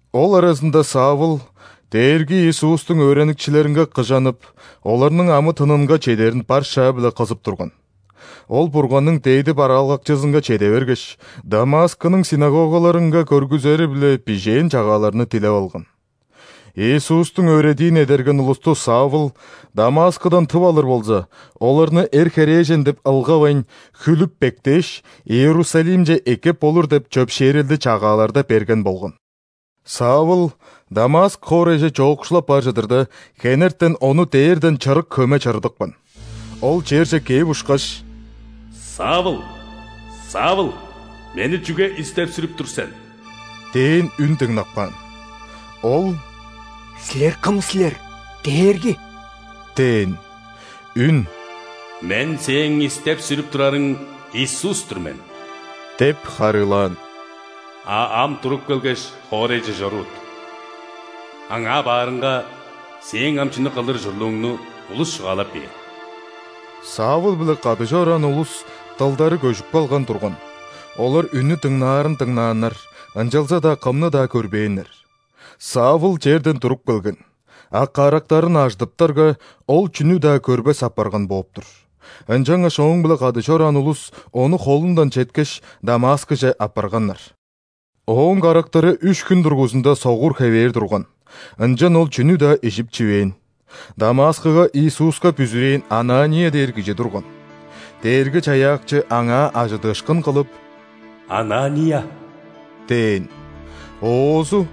Ол аразында Савл Дээрги Иисустуң өөреникчилеринге кыжанып, оларның амы-тынынга чедерин бар шаа-биле кызып турган. Ол Бурганның дээди бараалгакчызынга чеде бергеш, Дамаскының ·синагогаларынга көргүзери-биле бижээн чагааларны дилеп алган. Иисустуң өөредиин эдерген улусту Савл Дамаскыдан тып алыр болза, оларны эр-херээжен деп ылгавайн, хүлүп-бектээш, Иерусалимче эккеп болур деп чөпшээрелди чагааларда берген болган. Савл Дамаск хоорайже чоокшулап бар чыдырда, хенертен ону дээрден чырык хөме чырыдыпкан. Ол черже кээп ушкаш: «Савл! Савл! Мени чүге истеп-сүрүп тур сен?» – дээн үн дыңнап каан. Ол: «Силер кым силер, Дээрги?» – дээн. Үн: «Мен – сээң истеп-сүрүп турарың Иисус-тур мен – деп харыылаан. – А ам туруп келгеш, хоорайже чорувут. Аңаа баарыңга, сээң ам чүнү кылыр ужурлууңну улус чугаалап бээр». Савл-биле кады чораан улус дылдары көжүп калган турган: олар үннү дыңнаарын дыңнааннар, ынчалза-даа кымны-даа көрбээннер. Савл черден туруп келген, а карактарын ажыдыптарга, ол чүнү-даа көрбес апарган бооп-тур. Ынчангаш ооң-биле кады чораан улус ону холундан четкеш, Дамаскыже аппарганнар. Ооң карактары үш хүн дургузунда согур хевээр турган, ынчан ол чүнү-даа ижип-чивээн. Дамаскыга Иисуска бүзүрээн Анания дээр кижи турган. Дээрги-Чаяакчы аңаа ·ажыдыышкын кылып: «Анания!» – дээн. Оозу: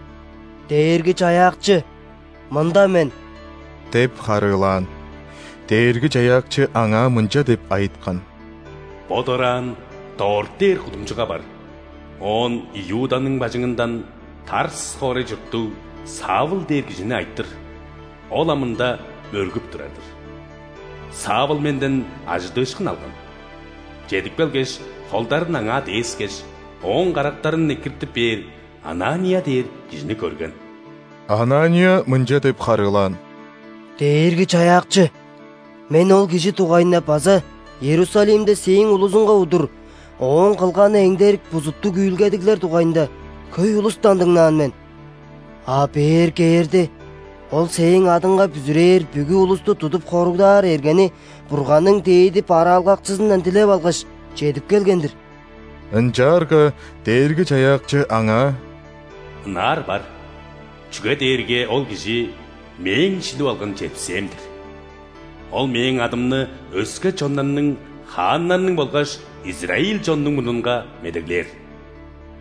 «Дээрги-Чаяакчы, мында мен!» – деп харыылаан. Дээрги-Чаяакчы аңаа мынча деп айыткан: «Бо дораан Дорт дээр кудумчуга бар, оон Иуданың бажыңындан Тарс хоорай чурттуг Савл дээр кижини айтыр, ол ам ында мөргүп турар-дыр. Савл Менден ажыдыышкын алган: чедип келгеш, холдарын аңаа дээскеш, ооң карактарын экиртип бээр Анания дээр кижини көрген». Анания мынча деп харыылаан: «Дээрги-Чаяакчы, мен ол кижи дугайында база Иерусалимде Сээң улузуңга удур ооң кылганы эңдерик бузуттуг үүлгедиглер дугайында хөй улустан дыңнаан мен. А бээр кээрде, ол Сээң адыңга бүзүрээр бүгү улусту тудуп хоругдаар эргени Бурганның дээди бараалгакчызындан дилеп алгаш, чедип келген-дир». Ынчаарга Дээрги-Чаяакчы аңаа: «Ынаар бар, чүге дээрге ол кижи – Мээң шилип алган чепсээм-дир. Ол Мээң адымны өске чоннарның, хааннарның болгаш израиль чоннуң мурнунга медеглээр.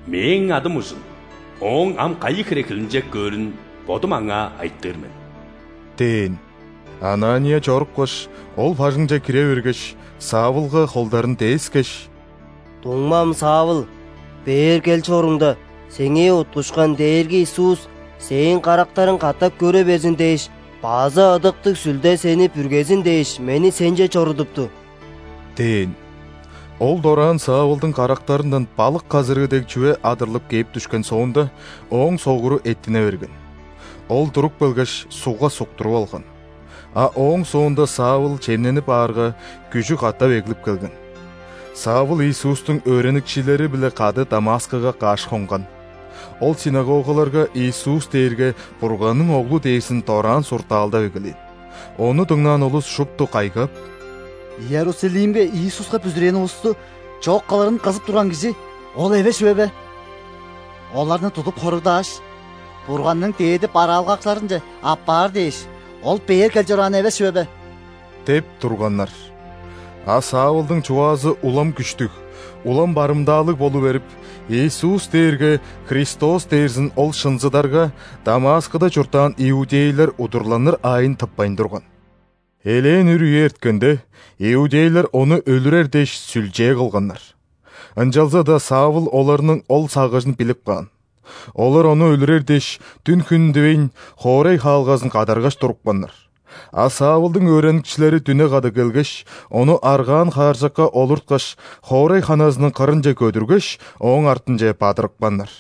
Мээң адым ужун ооң ам кайы хире хилинчек көөрүн Бодум аңаа айтыр мен» – дээн. Анания чорупкаш, ол бажыңче кире бергеш, Савлга холдарын дээскеш: «Дуңмам Савл! Бээр кел чоруңда, сеңээ уткушкан Дээрги Иисус сээң карактарың катап көре берзин дээш база Ыдыктыг Сүлде сени бүргезин дээш, мени сенче чорудупту» – дээн. Ол дораан Савлдың карактарындан балык казырыы дег чүве адырлып кээп дүшкен соонда, ооң согуру эттине берген. Ол туруп келгеш, ·сугга суктуруп алган. А ооң соонда Савл чемненип аарга, күжү катап эглип келген. Савл Иисустуң өөреникчилери-биле кады Дамаскыга каш хонган. Ол ·синагогаларга Иисус дээрге Бурганның Оглу дээрзин дораан суртаалдап эгелээн. Ону дыңнаан улус шупту кайгап: «Иерусалимге Иисуска бүзүрээн улусту чок кылырын кызып турган кижи ол эвес чүве бе? Оларны тудуп хоругдааш, Бурганның дээди бараалгакчыларынче аппаар дээш, ол бээр кел чораан эвес чүве бе?» – деп турганнар. А Савлдың чугаазы улам күштүг, улам барымдаалыг болу берип, Иисус дээрге Христос дээрзин ол шынзыдарга, Дамаскыда чурттаан иудейлер удурланыр аайын тыппайн турган. Элээн үр үе эрткенде, иудейлер ону өлүрер дээш, сүлчээ кылганнар. Ынчалза-даа Савл оларның ол сагыжын билип каан. Олар ону өлүрер дээш, дүн-хүн дивейн, хоорай хаалгазын кадаргаш турупканнар. А Савлдың өөреникчилери дүне када келгеш, ону аргаан хааржакка олурткаш, хоорай ханазының кырынче көдүргеш, ооң артынче бадырыпканнар.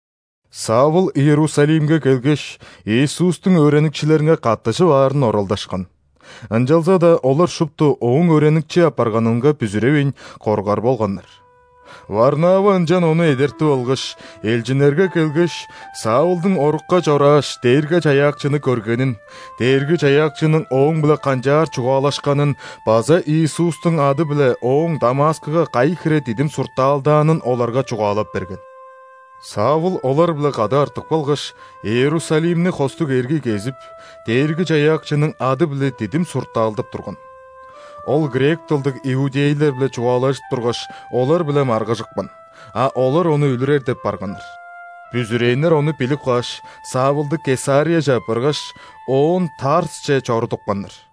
Савл Иерусалимге келгеш, Иисустуң өөреникчилеринге каттыжып аарын оралдашкан. Ынчалза-даа олар шупту ооң өөреникчи апарганынга бүзүревейн, коргар болганнар. Варнава ынчан ону эдертип алгаш, элчиннерге келгеш, Савлдың орукка чорааш, Дээрги-Чаяакчыны көргенин, Дээрги-Чаяакчының ооң-биле канчаар чугаалашканын база Иисустуң ады-биле ооң Дамаскыга кайы хире дидим суртаалдаанын оларга чугаалап берген. Савл олар-биле кады артып калгаш, Иерусалимни хостуг эргий кезип, Дээрги-Чаяакчының ады-биле дидим суртаалдап турган. Ол грек дылдыг иудейлер-биле чугаалажып тургаш, олар-биле маргыжыпкан, а олар ону өлүрер деп барганнар. Бүзүрээннер ону билип кааш, Савлды Кесарияже аппаргаш, оон Тарсче чорудупканнар.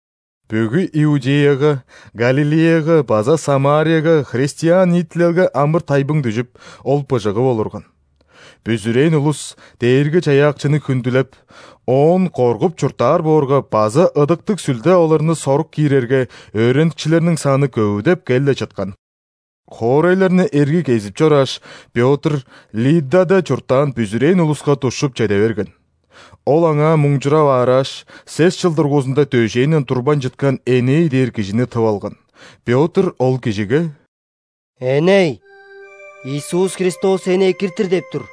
Бүгү Иудеяга, Галилеяга база Самарияга христиан ниитилелге амыр-тайбың дүжүп, ол быжыгып олурган. Бүзүрээн улус Дээрги-Чаяакчыны хүндүлеп, Оон коргуп чурттаар боорга база Ыдыктыг Сүлде оларны сорук киирерге, өөреникчилерниң саны көвүдеп кел-ле чыткан. Хоорайларны эргий кезип чорааш, Пётр Лиддада чурттаан бүзүрээн улуска душчуп чеде берген. Ол аңаа мунчурап аарааш, сес чыл дургузунда дөжээнден турбайн чыткан Эней дээр кижини тып алган. Пётр ол кижиге: «Эней! Иисус Христос сени экиртир деп тур.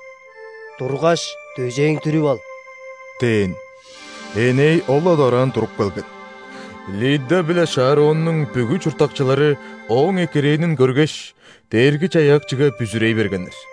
Тургаш, дөжээң дүрүп ал» – дээн. Эней ол-ла дораан туруп келген. Лидда биле Шароннуң бүгү чурттакчылары ооң экирээнин көргеш, Дээрги-Чаяакчыга бүзүрей бергеннер.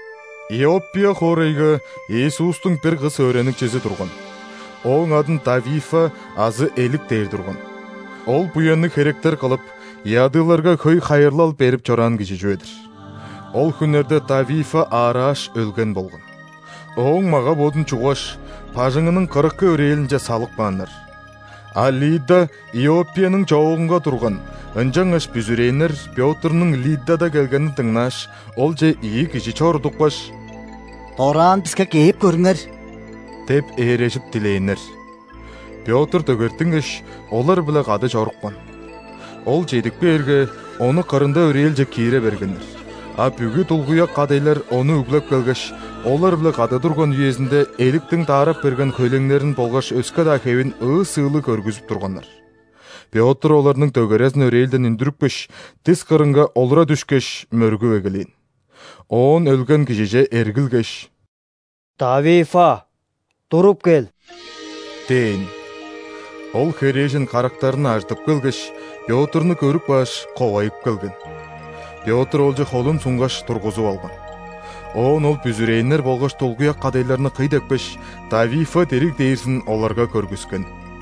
Иоппия хоорайга Иисустуң бир кыс өөреникчизи турган. Ооң адын Тавифа азы «Элик» дээр турган. Ол буянныг херектер кылып, ядыыларга хөй хайырлал берип чораан кижи чүве-дир. Ол хүннерде Тавифа аарааш, өлген болган. Ооң мага-бодун чуггаш, бажыңының кырыкы өрээлинче салып кааннар. А Лидда Иоппияның чоогунга турган, ынчангаш бүзүрээннер Пётрнуң Лиддада келгенин дыңнааш, олче ийи кижи чорудупкаш: «Дораан биске кээп көрүңер!» – деп ээрежип дилээннер. Пётр дөгертингеш, олар-биле кады чорупкан. Ол ��едип кээрге, ону кырында өрээлче киире бергеннер, а бүгү дулгуяк кадайлар ону үглеп келгеш, олар-биле кады турган үезинде Эликтиң даарап берген хөйлеңнерин болгаш өске-даа хевин ыы-сыылыг көргүзүп турганнар. Пётр оларның дөгерезин өрээлден үндүрүпкеш, дис кырынга олура дүшкеш, мөргүп эгелээн. Оон өлген кижиже эргилгеш: «Тавифа, туруп кел!» – дээн. Ол херээжен карактарын ажыдып келгеш, Пётрну көрүп кааш, ковайып келген. Пётр олче холун сунгаш, тургузуп алган. Оон ол бүзүрээннер болгаш дулгуяк кадайларны кый депкеш, Тавифа дириг дээрзин оларга көргүскен.